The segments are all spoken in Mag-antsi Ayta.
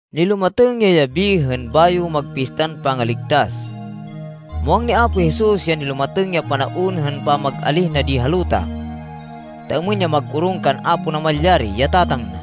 Nilumatêng ya yabi hên bayo mag Pistan Pangaligtas. Muwang ni Apo Jesus ya nilumatêng ya panaon hên pamag-alíh na di ha luta, ta êmên ya mag-orong kan Apo Namalyari, ya Tatang na.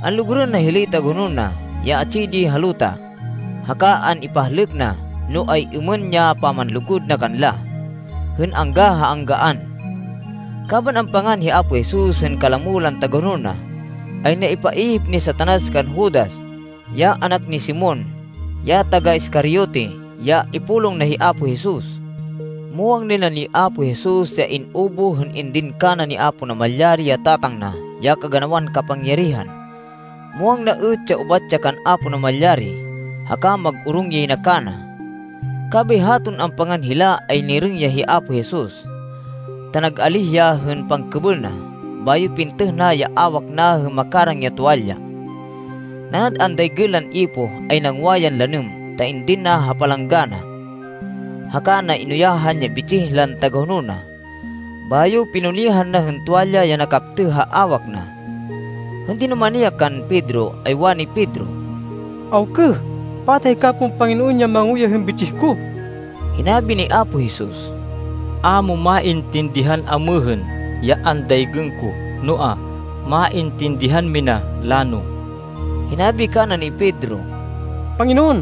Anlugurên na hilay tagahonol na, ya atsi di ha luta. Haka an-ipahlêk na, no ay-êmên ya pamanlugud na kanla hên angga ha anggaan. Kaban ampangan hi Apo Jesus hên kalamo lan tagahonol na, ay naipaihip ni Satanas kan Judas, ya anak ni Simon, ya taga-Iscariote, ya ipulong na hi Apo Jesus. Muwang nay na ni Apo Jesus ya in-ubuh hên indin kana ni Apo Namalyari, ya Tatang na, ya kaganawan kapangyarihan. Muwang na êt, ya ubat ya kan Apo Namalyari, haka mag-orong yay na kana. Kabay haton ampangan hila ay nirêng ya hi Apo Jesus, ta nag-alíh ya hên pangkêbêl na, bayo pintêh na ya awak na hên makarang ya tuwalya. Nanad andaygên lan ipoh, ay nangwa yan lanêm, ta indin na ha palanggana, haka na inuyahan ya bitsih lan tagahonol na. Bayo pinunihan na hên tuwalya ya nakaptêh ha awak na. Hên dinumani ya kan Pedro, ay wani Pedro, “Awkêh! Pata hika pon, Panginoon, ya manguyah hên bitsih ko?” Hinabi ni Apo Jesus, “A mo maintindihan amêhên, ya andaygên ko, noa, maintindihan mina lano.” Hinabi kana ni Pedro, “Panginoon,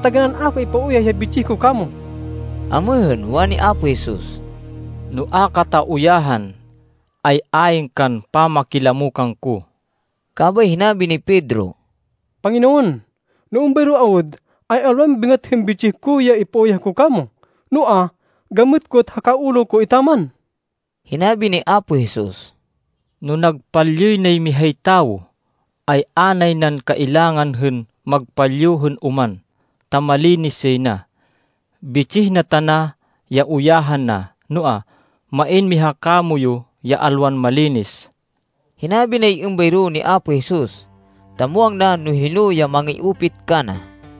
taganán a ko ipauyah ya bitsih ko kamo.” Amêhên, wani Apo Jesus, “No a kata uyahan, ay ayn kan pamakilamo kangko.” Kabay hinabi ni Pedro, “Panginoon, no êmbayro awud, ay alwan bêngat hên bitsih ko ya ipauyah ko kamo, noa, gamêt ko, haka ulo ko etaman.” Hinabi ni Apo Jesus, “No nagpalyuy nay mihay tawo, ay a nay nan kailangan hên magpalyu hên oman ta malinis yay na. Bitsih na tana ya uyahan na. Noa, main miha kamoyu ya alwan malinis.” (Hinabi nay êmbayro ni Apo Jesus, ta muwang na no hino ya mangi-upit kana.)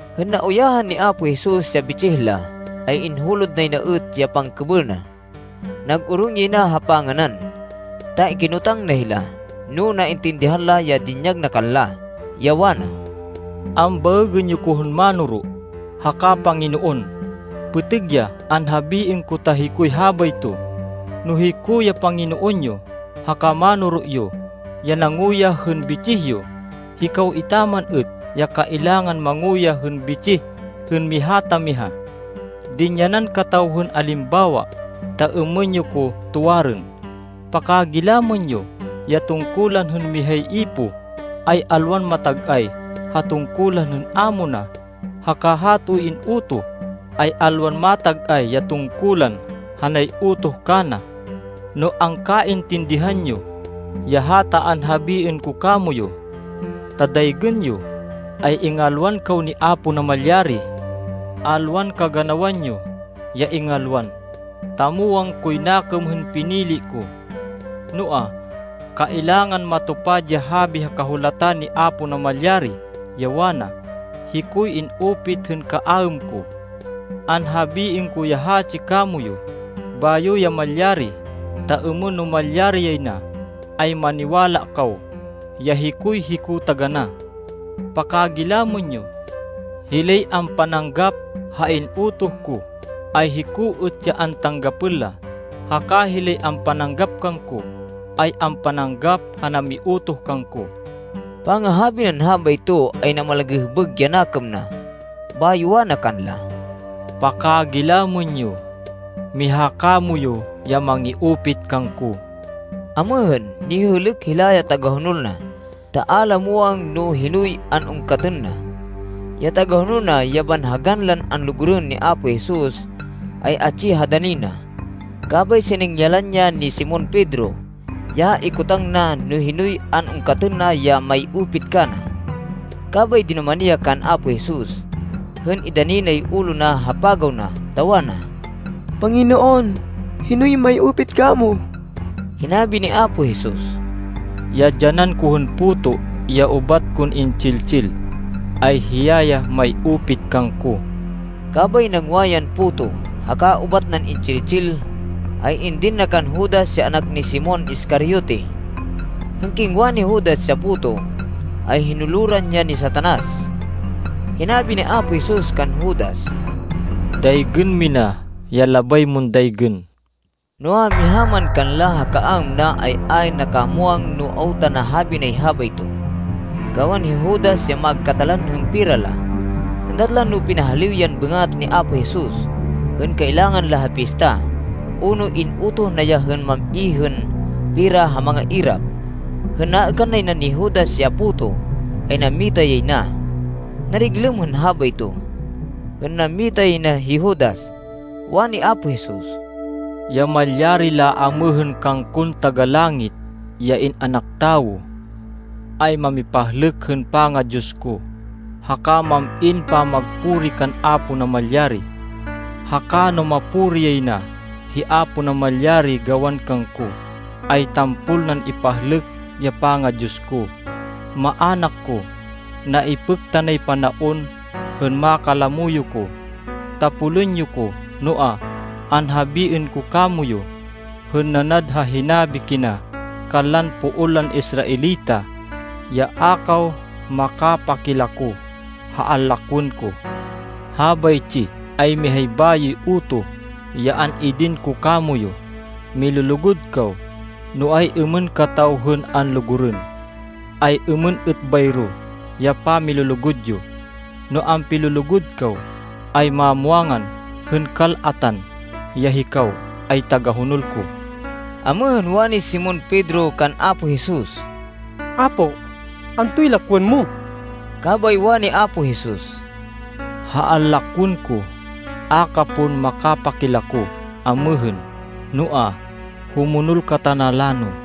Hên nauyahan ni Apo Jesus ya bitsih la, ay inhulod nay na êt ya pangkêbêl na. Nag-orong yay na ha panganan, ta kinotang na hila, no naintindihan la ya dinyag na kanla, ya wana, “Ambaêgên yo ko hên Mánoro, haka Panginoon. Pêtêg ya anhabiên yo ta hikoy habayto. No hiko, ya Panginoon yo, haka Mánoro yo, ya nanguyah hên bitsih yo, hikaw etaman êt ya kailangan manguyah hên bitsih hên miha ta miha. Dinyanan kataw hên alimbawa ta êmên yo ko tuwarên. Pakagilamên yo! Ya tungkulan hên mihay ipoh ay alwan matag-ay ha tungkulan hên amo na. Haka hatoy in-utoh, ay alwan matag-ay ya tungkulan ha nay-utoh kana. No angkaintindihan yo, ya hata anhabiên ko kamoyu, ta daygên yo, ay ingalwan kaw ni Apo Namalyari. “Alwan kaganawan yo ya ingalwan, ta muwang koy nakêm hên pinili ko. Noa, kailangan matupad ya habi ha Kahulatan ni Apo Namalyari, ya wana, ‘Hikoy in-upit hên kaaêm ko.’ Anhabiên ko ya hatsi kamoyu, bayo ya malyari, ta êmên no malyari yay na, ay maniwala kaw ya ‘Hikoy Hiko taganá.’ Pakagilamên yo. Hilay ampananggap ha in-utoh ko, ay hiko êt ya antanggapên la. Haka hilay ampananggap kangko, ay ampananggap ha namiutoh kangko.” Pangahabi nan habayto, ay namalagêhbêg ya nakêm na. Bayo wana kanla, “Pakagilamên yo! Miha kamoyu ya mangi-upit kangko.” Amêhên, nihêhêlêk hila ya tagahonol na, ta a la muwang no hinoy an-ungkatên na. Ya tagahonol na, ya banhagan lan anlugurên ni Apo Jesus, ay atsi ha dani na. Kabay siningyalan ya ni Simon Pedro, ya ikotang na, no hinoy an-ungkatên na ya may-upit kana. Kabay dinumani ya kan Apo Jesus, hên indani nay ulo na ha pagaw na, ta wana, “Panginoon, hinoy may-upit kamo?” Hinabi ni Apo Jesus, “Ya dyanan ko hên puto ya ubat kon intsil-tsil, ay hiya ya may-upit kangko.” Kabay nangwa yan puto, haka ubat nan intsil-tsil, ay indin na kan Judas ya anak ni Simon Iscariote. Hên kingwa ni Judas ya puto, ay hinuloran ya ni Satanas. Hinabi ni Apo Jesus kan Judas, “Daygên mina ya labay mon daygên.” Noa, miha man kanla ha kaaêm na, ay ayn nakamwang no awta nahabi nay habayto. Gawan hi Judas, ya magkatalan hên pera la, êndat la no pinahaliw yan bêngat ni Apo Jesus hên kailangan la ha pista, o no in-utoh na ya hên mam-i hên pera ha mangairap. Hên naêkan nay na ni Judas ya puto, ay nammita yay na. Nariglêm hên habayto. Hên nammita yay na hi Judas, wani Apo Jesus, “Ya malyari laamêhên, kangkon Taga-Langit, ya In-anak Tawo, ay mamipahlêk hên panga-Diyos ko, haka mam-in pamagpuri kan Apo Namalyari. Haka no mapuri yay na hi Apo Namalyari gawan kangko, ay tampol nan ipahlêk ya panga-Diyos ko. Maanak ko, naipêk tanay panaon hên makalamo yo ko. Tapolên yo ko, noa, anhabiên ko kamoyu, hên nanad ha hinabi kina kanlan poon lan Israelita, ya a kaw makapakilako ha anlakwên ko. Habaytsi ay mihay bayoy utoh ya an-idin ko kamoyu. Milulugud kaw! No ay-êmên kataw hên anlugurên ay, êmên êt bayro ya pamilulugud yo. No ampilulugud kaw, ay mamwangan hên kal-atan, ya hikaw ay tagahonol ko.” Amêhên, wani Simon Pedro kan Apo Jesus, “Apo, antoy lakwên mo?” Kabay wani Apo Jesus, “Ha anlakwên ko, a ka pon makapakilako amêhên, noa, humonol ka tana lano.”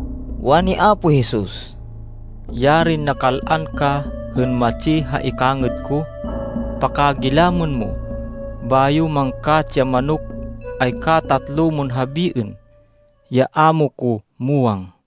Wani Apo Jesus, “Yarin nakal-an ka hên matsi ha ikangêd ko! Pakagilamên mo. Bayo mangkatsi ya manok, ay katatlo mon habiên, ya a mo ko muwang.”